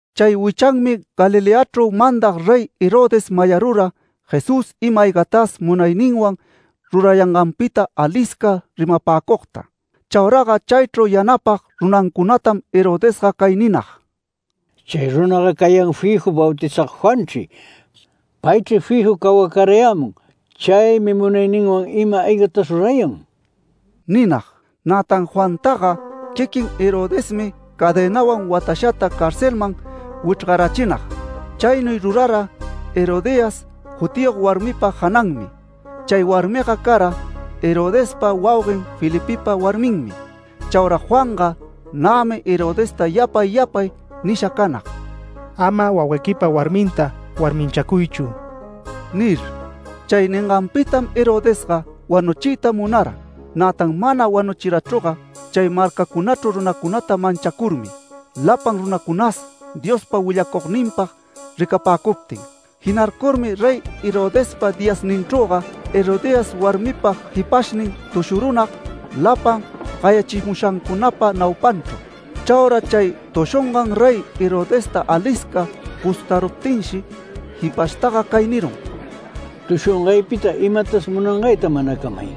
Chay wichanmi Galileachru mandag Rey Herodes mayarura Jesús ima-aygatas munayninwan rurayanganpita alisca rimapäcugta. Chauraga chaychru yanapag runancunatam Herodesga cay ninag: “Chay runaga cayan fiju Bautizag Juanchri. Paychri fiju cawacarayämun. Chaymi munayninwan ima-aygatas rurayan” ninag. Nätan Juantaga quiquin Herodesmi cadenawan watashata carcelman wichrgarachinag. Chaynuy rurara Herodías jutiyog warmipa jananmi. Chay warmiga cara Herodespa wauguen Felipepa warminmi. Chaura Juanga nämi Herodesta yapay yapay nisha canag “Ama wauguequipa warminta warminchacuychu” nir. Chay ninganpitam Herodesga wanuchiyta munara. Nätan mana wanuchirachüga chay marcachru runacunata manchacurmi, lapan runacunas Diospa willacugninpag ricapäcuptin. Jinarcurmi Rey Herodespa diyasninchrüga Herodías warmipa jipashnin tushurunag lapan gayachimushancunapa naupanchru. Chaura chay tushungan Rey Herodesta alisca gustaruptinshi, jipashtaga cay nirun: “Tushungaypita imatas munangayta manacamay.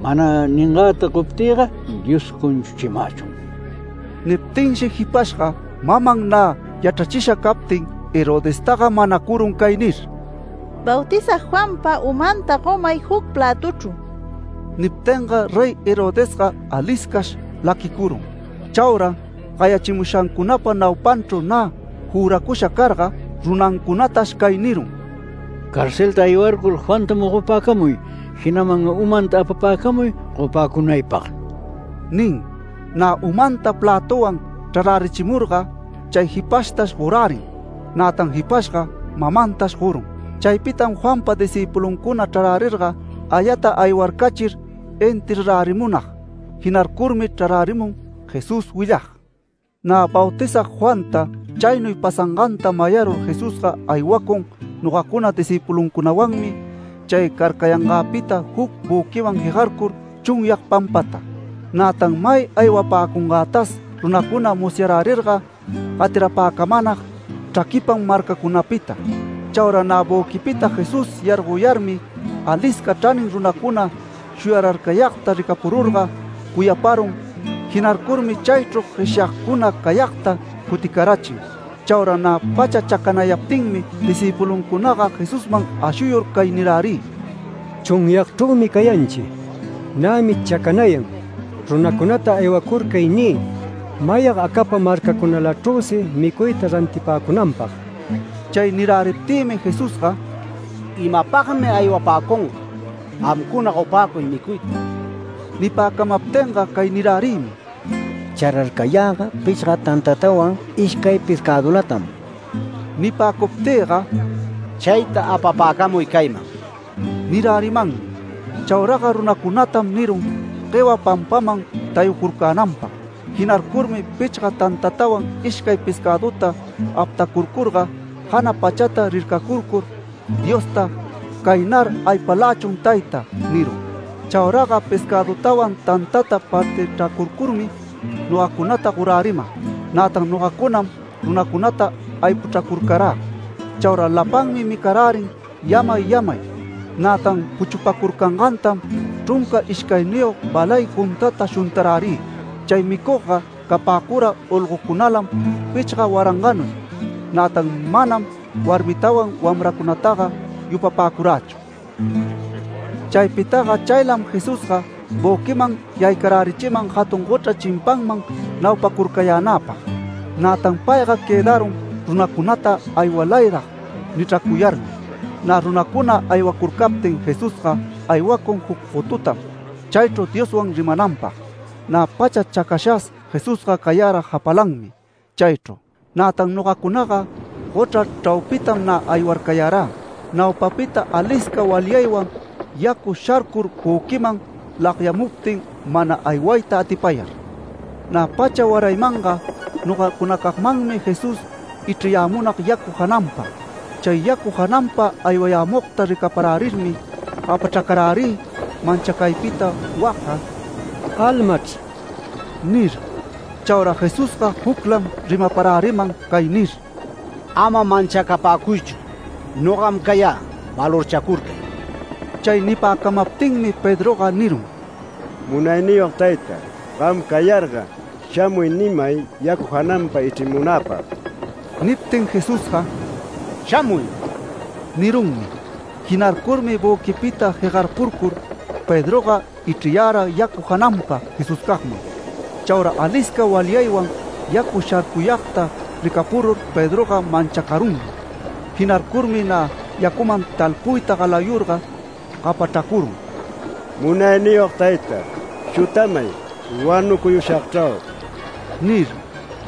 Mana ningäta goptïga Dios cunchuchimächun”. Niptinshi jipashga maman nä yachrachisha captin Herodestaga manacurun cay nir: “Bautizag Juanpa umanta gomay juc plätuchru”. Niptinga Rey Herodesga aliscash laquicurun. Chaura gayachimushancunapa naupanchru nä juracusha carga, runancunatash cay nirun: “Carcelta aywarcur Juanta mogopäcamuy, jinaman umanta apapäcamuy gopäcunaypag” nin. Nä umanta plätuwan chrarärichimurga chay jipashtash gorärin. Nätan jipashga mamantash gorun. Chaypitam Juanpa discïpuluncuna chrarärirga ayata aywarcachir enterrarärimunag. Jinarcurmi chrarärimun Jesús willag. Nä Bautizag Juanta chaynuy pasanganta mayarur Jesusga aywacun nogacuna discïpuluncunawanmi chay carcayangäpita juc büquiman jegarcur chunyag pampata. Nätan may aywapäcungätas runacuna musyarärirga gatirapäcamänag chraquipam marcacunapita. Chaura nä büquipita Jesús yargoyarmi, alisca chranin runacuna shuyararcayagta ricapururga cuyaparun, jinarcurmi chaychru gueshyagcuna cayagta cuticarachin. Chaura nä pacha chacanayaptinmi discïpuluncunaga Jesusman ashuyur cay nirärï: “Chunyagchrümi cayanchi. Nämi chacanayan. Runacunata aywacurcay niy, mayag acapa marcacunalachrüsi micuyta rantipäcunanpag”. Chay niräriptïmi Jesusga “¡Imapagmi aywapäcunga! Gamcuna gopäcuy micuyta”. Nipäcamaptinga cay nirärïmi: “Chararcayäga pichga tantatawan ishcay pescädulatam”. Nipäcuptïga “Chayta apapäcamuy cayman” nirärimanmi. Chauraga runacunatam nirun guewa pampaman tayucurcänanpag. Jinarcurmi pichga tantatawan ishcay pescäduta aptacurcurga, jana pachata rircacurcur Diosta “Caynar aypalächun Tayta” nirun. Chauraga pescädutawan tantata partichracurcurmi nogacunata goräriman. Nätan nogacunam runacunata aypuchracurcarä. Chaura lapanmi micarärin yamay yamay. Nätan puchupacurcangantam chrunca ishcayniyog balay juntata shuntarärï. Chay micugga capäcura olgocunalam pichga waranganuy, nätan manam warmitawan wamracunataga yupapäcurächu. Chaypitaga chaylam Jesusga büquiman yaycarärichiman jatun gochra chimpanman naupacurcayänäpag. Nätan payga quëdarun runacunata “Aywalayrag” nichracuyarmi. Nä runacuna aywacurcaptin Jesusga aywacun juc gotutam chaychru Dioswan rimananpag. Nä pacha chacashas Jesusga cayara japalanmi chaychru. Nätan nogacunaga gochra chraupitam nä aywarcayarä. Naupapita alisca walyaywan yacu sharcur büquiman lagyamuptin mana aywayta atipayar. Nä pacha waraymanga nogacunacagmanmi Jesús ichriyämunag yacu jananpa. Chay yacu jananpa aywayämugta ricaparärirmi gapachracarärï manchacaypita wacga “Almachr” nir. Chaura Jesusga juclam rimaparäriman cay nir: “Ama manchacapäcuychu. Nogam cayä. Valorchacurcay”. Chay nipäcamaptinmi Pedroga nirun: “Munayniyog tayta, gam cayarga ‘Shamuy’ nimay yacu jananpa ichrimunäpag”. Niptin Jesusga “Shamuy” nirunmi. Jinarcurmi büquipita jegarpurcur Pedroga ichriyara yacu jananpa Jesuscagman. Chaura alisca walyaywan yacu sharcuyagta ricapurur Pedroga manchacarunmi. Jinarcurmi nä yacuman talpuyta galayurga gapachracurun “¡Munayniyog tayta, chutamay! ¡Wanucuyushagchrau!” nir.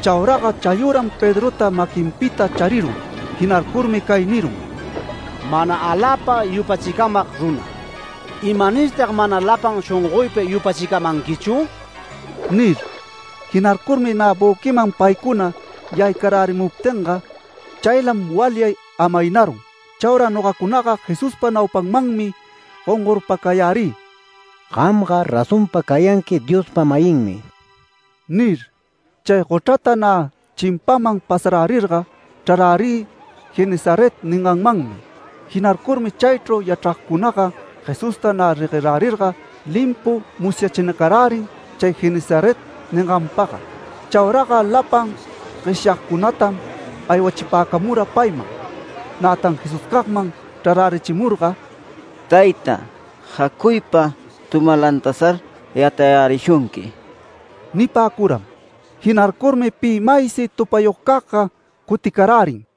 Chauraga chayüram Pedrota maquinpita charirun. Jinarcurmi cay nirun: “¡Mana aläpa yupachicamag runa! ¿Imanirtag mana lapan shongoypa yupachicamanquichu?” nir. Jinarcurmi nä büquiman paycuna yaycarärimuptinga, chaylam walyay amaynarun. Chaura nogacunaga Jesuspa naupanmanmi gongorpacayärï “Gamga razonpa cayanqui Diospa-mayinmi” nir. Chay gochrata nä chimpaman pasarärirga, chrarärï ‘Genesaret’ ninganmanmi. Jinarcurmi chaychru yachragcunaga Jesusta nä reguerärirga limpu musyachinacarärin chay Genesaret ninganpaga. Chauraga lapan gueshyayagcunatam aywachipäcamura payman. Nätan Jesuscagman chrarärichimurga, “Tayta, jacuypa tumalantasar yatayärishunqui” nipäcuram. Jinarcurmi pi maysi tupayugcagga cuticarärin.